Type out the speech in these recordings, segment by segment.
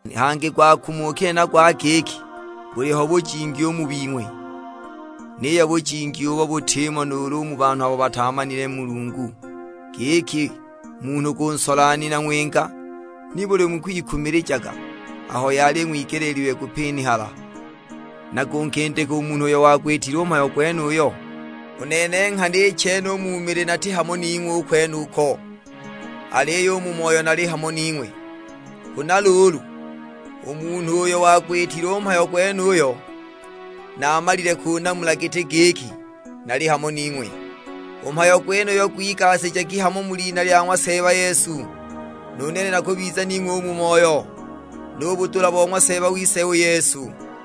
Hangi gwakumukile na gwa giki buliho bujingi u mu bing'we; niyo bujingi ubo butimo nuulu u mu banhu abo bataamanile Mulungu, giki munhu kunsola nina ng'winga! Nibuli mukwikumilijaga, aho yali ing'wigeleelilwe kupinihala, na kunkindika u munhu uyo wagwitile u mhayo gwenuyo? U nene nghana i chene u mu mili nati hamo ning'we u kwenuko, aliyo u mu moyo nali hamo ning'we; huna luulu u munhu uyo wagwitile u mhayo gwenuyo naamalile kunamula giti giki nali hamo ning'we. U mhayo gwenuyo gwigasijagi hamo mu lina lya ng'wa Seeba Yesu, nu nene nakubiza ning'we u mu moyo, nu budula bo ng'wa Seeba wise u Yesu.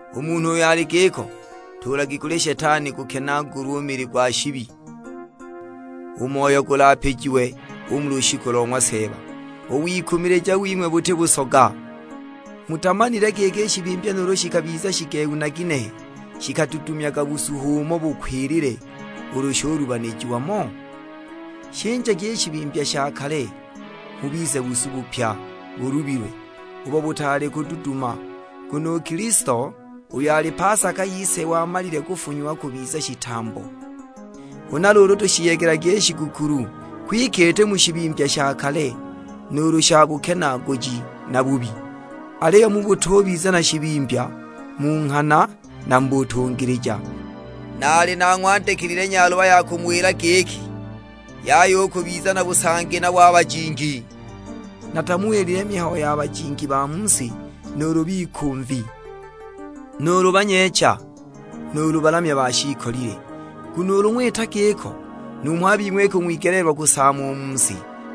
U munhu uyo ali giko ntuulagi kuli Shetani, gukenaagulwe u mili gwa shibi, u moyo gulapijiwe u mu lushiku lo ng'wa Seeba. U wikumilija wing'we buti busoga; mutamanile giki i shibimbya nuulu shikabiza shigehu na ginehe shikadudumyaga busu h'umo bukwilile ulu shulubanijiwa mo? Shinjagi i shibimbya sha kale, mubize busu bupya bulubilwe, ubo butaali kududuma. Nguno u Kilisto, uyo ali pasaka yise wamalile kufunyiwa kubiza shitambo. Huna luulu tushiyegelagi i shigukulu; kwike iti mu shibimbya sha kale, nuulu sha bukenaaguji na bubi; aliyo mu butubiza na shibimbya, mu nghana na mu butungilija. Naali nang'wandikilile nyaluba ya kumuwila giki, yaya u kubiza na busangi nabo a bajingi. Natamuwilile mihayo ya bajingi ba mu si, nuulu bikumvi, nuulu banyeecha, nuulu balamya ba shiikolile; nguno ulu ng'wita giko, numho a bing'we ikung'wigeleelwa kusaama u mu si!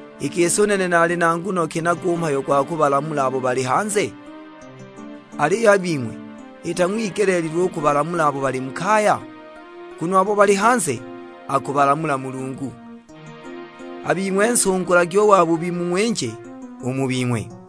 I gisi u nene nali na nguno ki nago u mhayo gwa kubalamula abo bali hanze? Aliyo a bing'we, itang'wigeleelilwe u kubalamula abo bali mu kaya? Nguno abo bali hanze akubalamula Mulungu, a bing'we nsungulagi u wabubi mung'winje u mu bing'we.